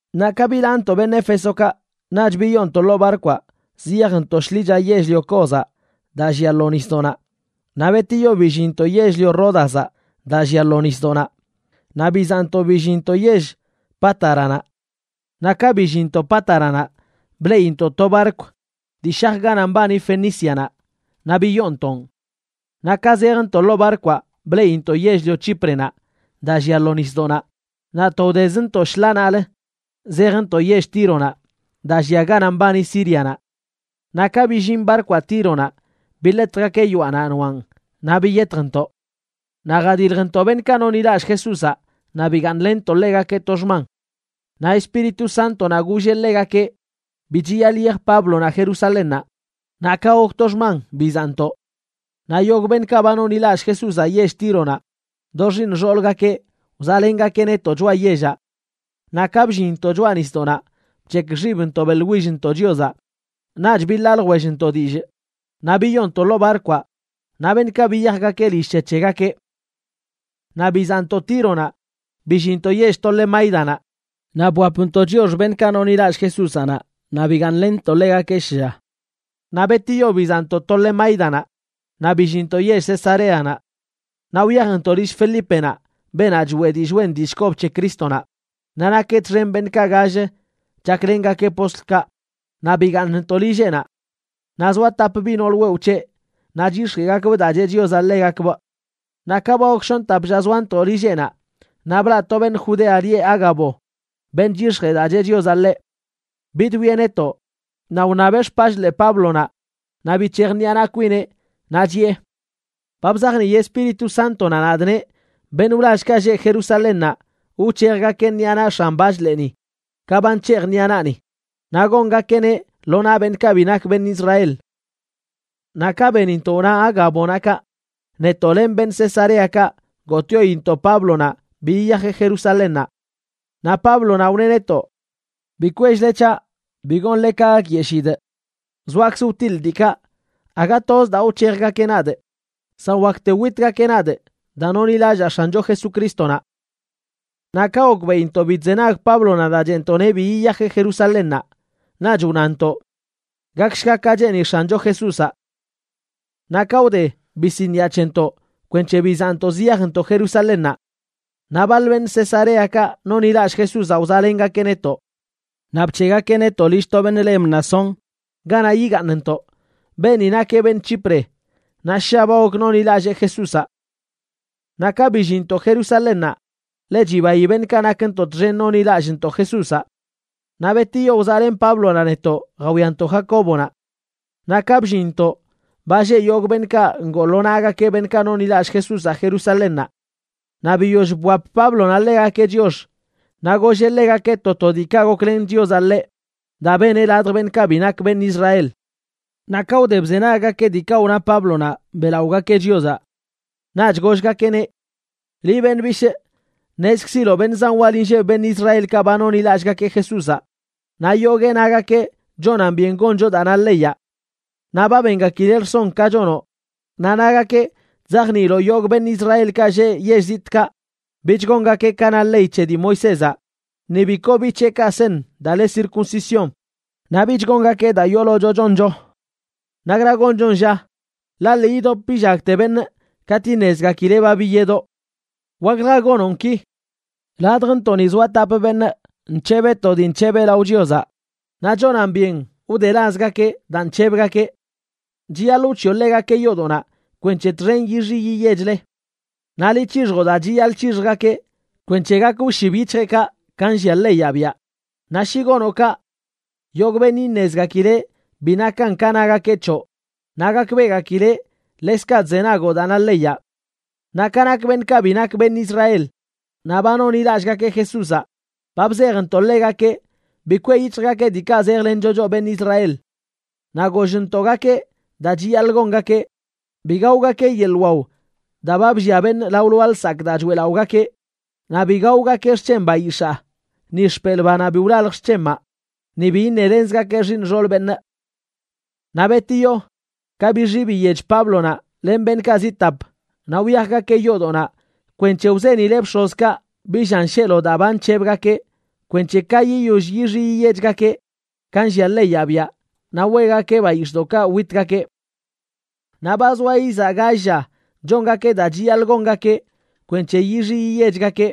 Naꞌ ka bilaantoꞌ beṉꞌ Éfesokaꞌ, naꞌch biyoontoꞌ ḻoo barkwaꞌ ziyajntoꞌ shḻicha yell-lio Cozaꞌ daa llia lo nisdoꞌnaꞌ, naꞌ betiyo billinntoꞌ yell-lio Ródazaꞌ daa llia lo nisdoꞌnaꞌ, naꞌ bizaꞌntoꞌ billinntoꞌ yell Pátaranaꞌ. Naꞌ ka billinntoꞌ Pátaranaꞌ bleꞌintoꞌ to barkw dii shaj ganaꞌ mbani Fenícianaꞌ, naꞌ biyoontoꞌn. Naꞌ ka zejntoꞌ ḻoo barkwaꞌ bleꞌintoꞌ yell-lio Chíprenaꞌ daa llia lo nisdoꞌnaꞌ naꞌ to wdezntoꞌ shḻaanaꞌlə zejntoꞌ yell Tíronaꞌ daa llia ganaꞌ mbani Sírianaꞌ. Naꞌ ka billin barkwaꞌ Tíronaꞌ, biḻetjgakeꞌ yoaꞌnaꞌ noaꞌn naꞌ biyetjntoꞌ. Naꞌ jadiljntoꞌ beṉꞌkaꞌ nonḻilallꞌ Jesúzaꞌ naꞌ bigaaṉlenntoꞌ ḻegakeꞌ to xman. Naꞌ Espíritu Sántonaꞌ golleꞌ ḻegakeꞌ bi chiyaḻꞌ yiyaj Páblonaꞌ Jerusalénnaꞌ. Naꞌ ka gok to xman bizaꞌntoꞌ. Naꞌ yogꞌ beṉꞌkaꞌ ba nonḻilallꞌ Jesúzaꞌ yell Tíronaꞌ, do xiiṉ xoolgakeꞌ, wzaꞌlengakeꞌ netoꞌ choꞌa yellaꞌ. Naꞌ ka bllinntoꞌ choꞌa nisdoꞌnaꞌ, bc̱hekꞌ xibntoꞌ beꞌḻwillntoꞌ Chiozaꞌ. Naꞌch biḻaa ljwellntoꞌ dillꞌ, naꞌ biyoontoꞌ ḻoo barkwaꞌ, naꞌ beṉꞌkaꞌ biyajgakeꞌ lill c̱he c̱hegakeꞌ. Naꞌ bizaꞌntoꞌ Tíronaꞌ billinntoꞌ yell Tolemáidanaꞌ, naꞌ bwapntoꞌ chiox beṉꞌkaꞌ nonḻilallꞌ Jesúzaꞌ naꞌ, naꞌ bigaaṉlenntoꞌ ḻegakeꞌ shlla. Naꞌ betiyo bizaꞌntoꞌ Tolemáidanaꞌ naꞌ billinntoꞌ yell Cesareanaꞌ. Naꞌ wyajntoꞌ lill Felípenaꞌ beenaꞌ choeꞌ dillꞌ wen dillꞌ kob c̱he Crístonaꞌ, naꞌ nakeꞌ txen beṉꞌkaꞌ gall chaklengakeꞌ postlkaꞌ, naꞌ bigaaṉntoꞌ lilleꞌnaꞌ. Naꞌ zoa tap biꞌ nool wewꞌ c̱heꞌ, naꞌ chyix̱jeꞌgakbꞌ daa cheꞌ Chiozaꞌ ḻegakbꞌ. Naꞌ ka ba gok shoṉ tap lla zoantoꞌ lilleꞌnaꞌ, naꞌ blaꞌ to beṉꞌ Judea lieꞌ Ágabo, beṉꞌ chyix̱jee daa cheꞌ Chiozaꞌ ḻeꞌ. Bidwieꞌ netoꞌ naꞌ wṉabeꞌ xpachḻee Páblonaꞌ naꞌ bic̱hej ṉiꞌa naꞌ kwineꞌ, naꞌ chiꞌe: ―Ba bzajnii Espíritu Sántonaꞌ nadꞌ neꞌ beṉꞌ wlallkaꞌ lleꞌ Jerusalénnaꞌ wc̱hejgakeꞌ ṉiꞌa naꞌ x̱an bachḻeeni ka ba nc̱hejꞌ ṉiꞌa naꞌni, naꞌ gongakeꞌneꞌ lo naꞌ beṉꞌkaꞌ bi nak beṉꞌ Israel. Naꞌ ka benintoꞌ wna Ágabonaꞌ kaꞌ, netoꞌ len beṉꞌ Cesareakaꞌ gotꞌyointoꞌ Páblonaꞌ bi yiyajeꞌ Jerusalénnaꞌ. Naꞌ Páblonaꞌ wneꞌ netoꞌ: ―Bi kwell-le c̱haꞌ, bi gonle ka gakyeshidꞌ. Zoakzꞌ wtiḻꞌ diikaꞌ, aga toz daa wc̱hejgakeꞌ nadꞌ, san wakte witgakeꞌ nadꞌ daa nonḻilallaa X̱ancho Jesucrístonaꞌ. Naꞌ ka gokbeꞌintoꞌ bi chzenag Páblonaꞌ daa cheꞌntoꞌneꞌ bi yiyajeꞌ Jerusalénnaꞌ, naꞌch wnantoꞌ: ―Gakshga ka cheeni X̱ancho Jesúzaꞌ. Naꞌ ka wde, bisiniꞌa c̱hentoꞌ kwenc̱he bizaꞌntoꞌ ziyajntoꞌ Jerusalénnaꞌ. Naꞌ baḻ beṉꞌ Cesareakaꞌ nonḻilallꞌ Jesúzaꞌ wzaꞌlengakeꞌ netoꞌ. Naꞌ bc̱heꞌgakeꞌ netoꞌ lill to beṉꞌ le Mnasón, ganaꞌ yigaaṉntoꞌ. Beeni nakeꞌ beṉꞌ Chipre naꞌ ssha ba gok nonḻilallee Jesúzaꞌ. Naꞌ ka billinntoꞌ Jerusalénnaꞌ, ḻe chibayi beṉꞌkaꞌ nakntoꞌ txen nonḻilallꞌntoꞌ Jesúzaꞌ. Naꞌ betiyo wzaꞌlen Páblonaꞌ netoꞌ jawiantoꞌ Jacóbonaꞌ. Naꞌ ka bllinntoꞌ, ba lleꞌ yogꞌ beṉꞌkaꞌ ngoo lo naꞌgakeꞌ beṉꞌkaꞌ nonḻilallꞌ Jesúzaꞌ Jerusalénnaꞌ. Naꞌ biyoll bwap Páblonaꞌ ḻegakeꞌ chiox, naꞌ golleꞌ ḻegakeꞌ to to diikaꞌ goklen Chiozaꞌ ḻeꞌ daa beneꞌ ladj beṉꞌkaꞌ bi nak beṉꞌ Israel. Naꞌ ka wde bzenaggakeꞌ diikaꞌ wna Páblonaꞌ, beꞌlaꞌogakeꞌ Chiozaꞌ. Naꞌch gollgakeꞌneꞌ: ―Liꞌ, beṉꞌ bishꞌ, ṉezkziloꞌ beṉꞌ zan wal inlleb beṉꞌ Israelkaꞌ ba nonḻilallꞌgakeꞌ Jesúzaꞌ, naꞌ yoguee nagakeꞌ chonan byen goncho daa na leyaꞌ. Naꞌ ba bengakileꞌ rson ka chonoꞌ, naꞌ nagakeꞌ chzajniiloꞌ yogꞌ beṉꞌ Israelkaꞌ lleꞌ yell zitꞌkaꞌ bich gongakeꞌ ka na ley c̱he dii Moisézaꞌ, ni bi koo biꞌ c̱heꞌkaꞌ seṉ daa le circuncisión, naꞌ bich gongakeꞌ daa yoolocho choncho. ¿Nakra gonchon, lla? Ḻaꞌ lii idop illagte beṉꞌ katꞌ iṉezgakileꞌ ba biyedoꞌ. Waklja gonoꞌn ki: Ladjntoꞌni zoa tap beṉꞌ nc̱hebeꞌ to dii nc̱hebeꞌ lao Chiozaꞌ, naꞌ chonan byen wdelazgakeꞌ daa nc̱hebgakeꞌ. Chiyaḻꞌ wc̱hiꞌo ḻegakeꞌ yoodoꞌnaꞌ kwenc̱he txen yixi yiyechle. Naꞌ liꞌ c̱hixjoꞌ daa chiyaḻꞌ c̱hixjgakeꞌ kwenc̱he gak wshib yic̱hjeꞌkaꞌ ka nllia leyaꞌ biaꞌ. Naꞌ shi gonoꞌ kaꞌ, yogꞌ beṉꞌ iṉezgakileꞌ bi nakan ka nagakeꞌ c̱hoꞌ, naꞌ gakbeꞌgakileꞌ ḻekzkaꞌ chzenagoꞌ daa na leyaꞌ. Naꞌ ka nak beṉꞌkaꞌ bi nak beṉꞌ Israel naꞌ ba nonḻilallꞌgakeꞌ Jesúzaꞌ, ba bzejntoꞌ ḻegakeꞌ bi kweꞌ yic̱hjgakeꞌ diikaꞌ zejlencho choꞌ beṉꞌ Israel. Naꞌ gollntoꞌgakeꞌ daa chiyaḻꞌ gongakeꞌ: bi gaogakeꞌ yeḻꞌ wao daa ba bllia beṉꞌ lao lwaa lsakꞌ daa choeꞌlaꞌogakeꞌ, naꞌ bi gaogakeꞌ xc̱hen bayix̱aa, ni xpelꞌ banaꞌ bi wlalj xc̱hemaꞌ, naꞌ bi iṉelenzgakeꞌ xiiṉ xool beṉꞌ. Naꞌ betiyo ka bixi biyech Páblonaꞌ len beṉꞌkaꞌ zi tap, naꞌ wyajgakeꞌ yoodoꞌnaꞌ kwenc̱he wzenileꞌ bx̱ozkaꞌ bi llan sheelo daa ba nc̱hebgakeꞌ kwenc̱he ka yiyoll yixi yiyechgakeꞌ ka nllia leyaꞌ biaꞌ naꞌ weꞌgakeꞌ bayix̱ꞌdoꞌkaꞌ witgakeꞌ. Naꞌ ba zoa izaa gall lla chongakeꞌ daa chiyaḻꞌ gongakeꞌ kwenc̱he yixi yiyechgakeꞌ,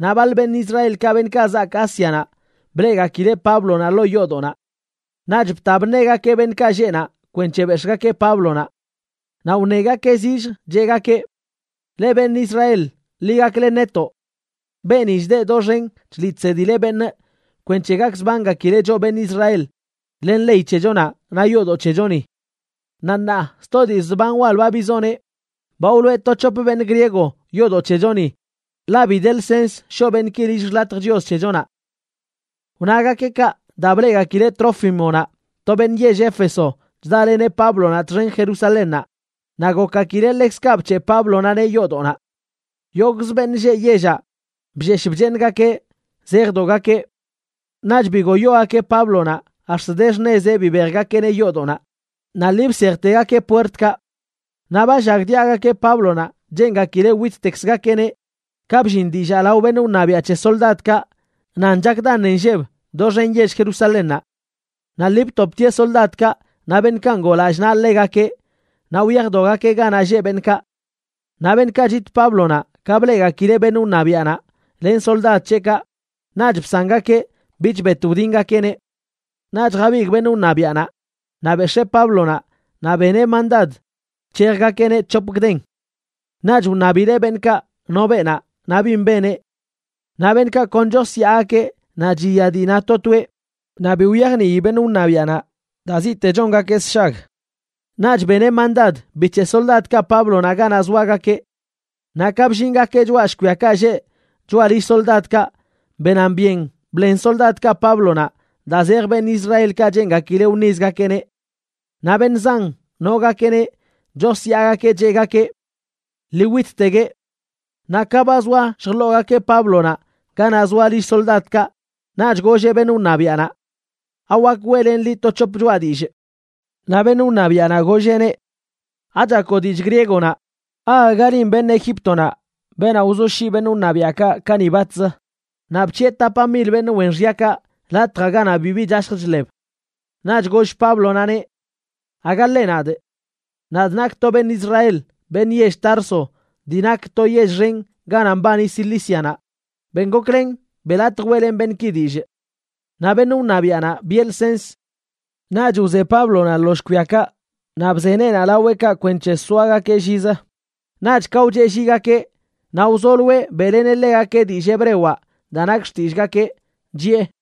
naꞌ baḻ beṉꞌ Israelkaꞌ, beṉꞌkaꞌ zaak Ásianaꞌ, bleꞌgakileꞌ Páblonaꞌ ḻoo yoodoꞌnaꞌ. Naꞌch bta bṉegakeꞌ beṉꞌkaꞌ lleꞌ naꞌ, kwenc̱he bex̱ꞌgakeꞌ Páblonaꞌ. Naꞌ wṉegakeꞌ zilljə cheꞌgakeꞌ: ―Leꞌ, beṉꞌ Israel, ḻi gaklen netoꞌ. Beeni chdeꞌ doxen chliꞌ chsedileꞌ beṉꞌ kwenc̱he gakzbangakileꞌ choꞌ beṉꞌ Israel, len ley c̱hechonaꞌ naꞌ yoodoꞌ c̱hechoni. Naꞌ ṉaa sto dii zban wal ba bizoneꞌ, ba wloꞌe to c̱hop beṉꞌ griego yoodoꞌ c̱hechoni, ḻaꞌ bi de lsens shoꞌ beṉꞌki lill xḻatj Chios c̱hechonaꞌ. Wnagakeꞌ kaꞌ daa ba bleꞌgakileꞌ Trófimonaꞌ, to beṉꞌ yell Éfeso, chdaleneꞌ Páblonaꞌ txen Jerusalénnaꞌ, naꞌ gokgakileꞌ ḻekzkaꞌ bc̱heꞌ Páblonaꞌneꞌ yoodoꞌnaꞌ. Yogꞌz beṉꞌ lleꞌ yellaꞌ bllesh bcheeṉgakeꞌ zejdogakeꞌ. Naꞌch bigoyogakeꞌ Páblonaꞌ ax̱t de xṉezeꞌ bibejgakeꞌneꞌ yoodoꞌnaꞌ, naꞌ lii bsejtegakeꞌ puertkaꞌ. Naꞌ ba llagdiaꞌgakeꞌ Páblonaꞌ cheengakileꞌ wittekzgakeꞌneꞌ ka bllin dillaa lao beṉꞌ wṉabiaꞌ c̱he soldadkaꞌ nan chak daṉe nlleb doxen yell Jerusalénnaꞌ. Naꞌ lii btoptieꞌ soldadkaꞌ naꞌ beṉꞌkaꞌ ngoo lallꞌ naꞌ ḻegakeꞌ naꞌ wyajdogakeꞌ ganaꞌ lleꞌ beṉꞌkaꞌ. Naꞌ beṉꞌkaꞌ chit Páblonaꞌ ka bleꞌgakileꞌ beṉꞌ wṉabiaꞌnaꞌ len soldad c̱heꞌkaꞌ, naꞌch bsangakeꞌ bich bet wdingakeꞌneꞌ. Naꞌch jabigꞌ beṉꞌ wṉabiaꞌnaꞌ, naꞌ bex̱ee Páblonaꞌ naꞌ beneꞌ mandad bc̱hejgakeꞌneꞌ c̱hop gden. Naꞌch wṉabileꞌ beṉꞌkaꞌ no beenaꞌ naꞌ bin beneꞌ. Naꞌ beṉꞌkaꞌ kon chosyaagakeꞌ naꞌ chiya dii na to toeꞌ, naꞌ bi wyajnii beṉꞌ wṉabiaꞌnaꞌ daa ziꞌte chongakeꞌ sshag. Naꞌch beneꞌ mandad bic̱heꞌ soldadkaꞌ Páblonaꞌ ganaꞌ zoagakeꞌ. Naꞌ ka bllingakeꞌ choꞌa shkwiakaꞌ lleꞌ choꞌa lill soldadkaꞌ benan byen bḻen soldadkaꞌ Páblonaꞌ daa zej beṉꞌ Israelkaꞌ cheengakileꞌ wṉizgakeꞌneꞌ. Naꞌ beṉꞌ zan nogakeꞌneꞌ chosyaagakeꞌ, cheꞌgakeꞌ: ―¡Ḻii wittegueꞌ! Naꞌ ka ba zoa lljḻoogakeꞌ Páblonaꞌ ganaꞌ zoa lill soldadkaꞌ, naꞌch golleꞌ beṉꞌ wṉabiaꞌnaꞌ: ―¿Awak weꞌlenꞌ liꞌ to c̱hop choꞌa dillꞌ? Naꞌ beṉꞌ wṉabiaꞌnaꞌ golleꞌneꞌ: ―¿Achakoꞌ dillꞌ griegonaꞌ? ¿Aaga linꞌ beṉꞌ Egíptonaꞌ beenaꞌ wzoshyiꞌ beṉꞌ wṉabiaꞌkaꞌ kani batzə, naꞌ bc̱hiꞌe tapa mil beṉꞌ wen xyakaꞌ latjaꞌ ganaꞌ bibi chashj chḻeb? Naꞌch goll Páblonaꞌneꞌ: ―Aga ḻeꞌ nadꞌ. Nadꞌ nakꞌ to beṉꞌ Israel, beṉꞌ yell Tarso dii nak to yell xen ganaꞌ mbani Cilícianaꞌ. Ben goklen beꞌ latj weꞌlenꞌ beṉꞌki dillꞌ. Naꞌ beṉꞌ wṉabiaꞌnaꞌ biꞌe lsens. Naꞌch wze Páblonaꞌ lo shkwiakaꞌ naꞌ bze neenaꞌ laweꞌkaꞌ kwenc̱he soagakeꞌ llizə. Naꞌch ka wcheꞌlligakeꞌ naꞌ wzoloeꞌ beꞌleneꞌ ḻegakeꞌ dillꞌ hebrewaꞌ daa nak xtillꞌgakeꞌ, chiꞌe: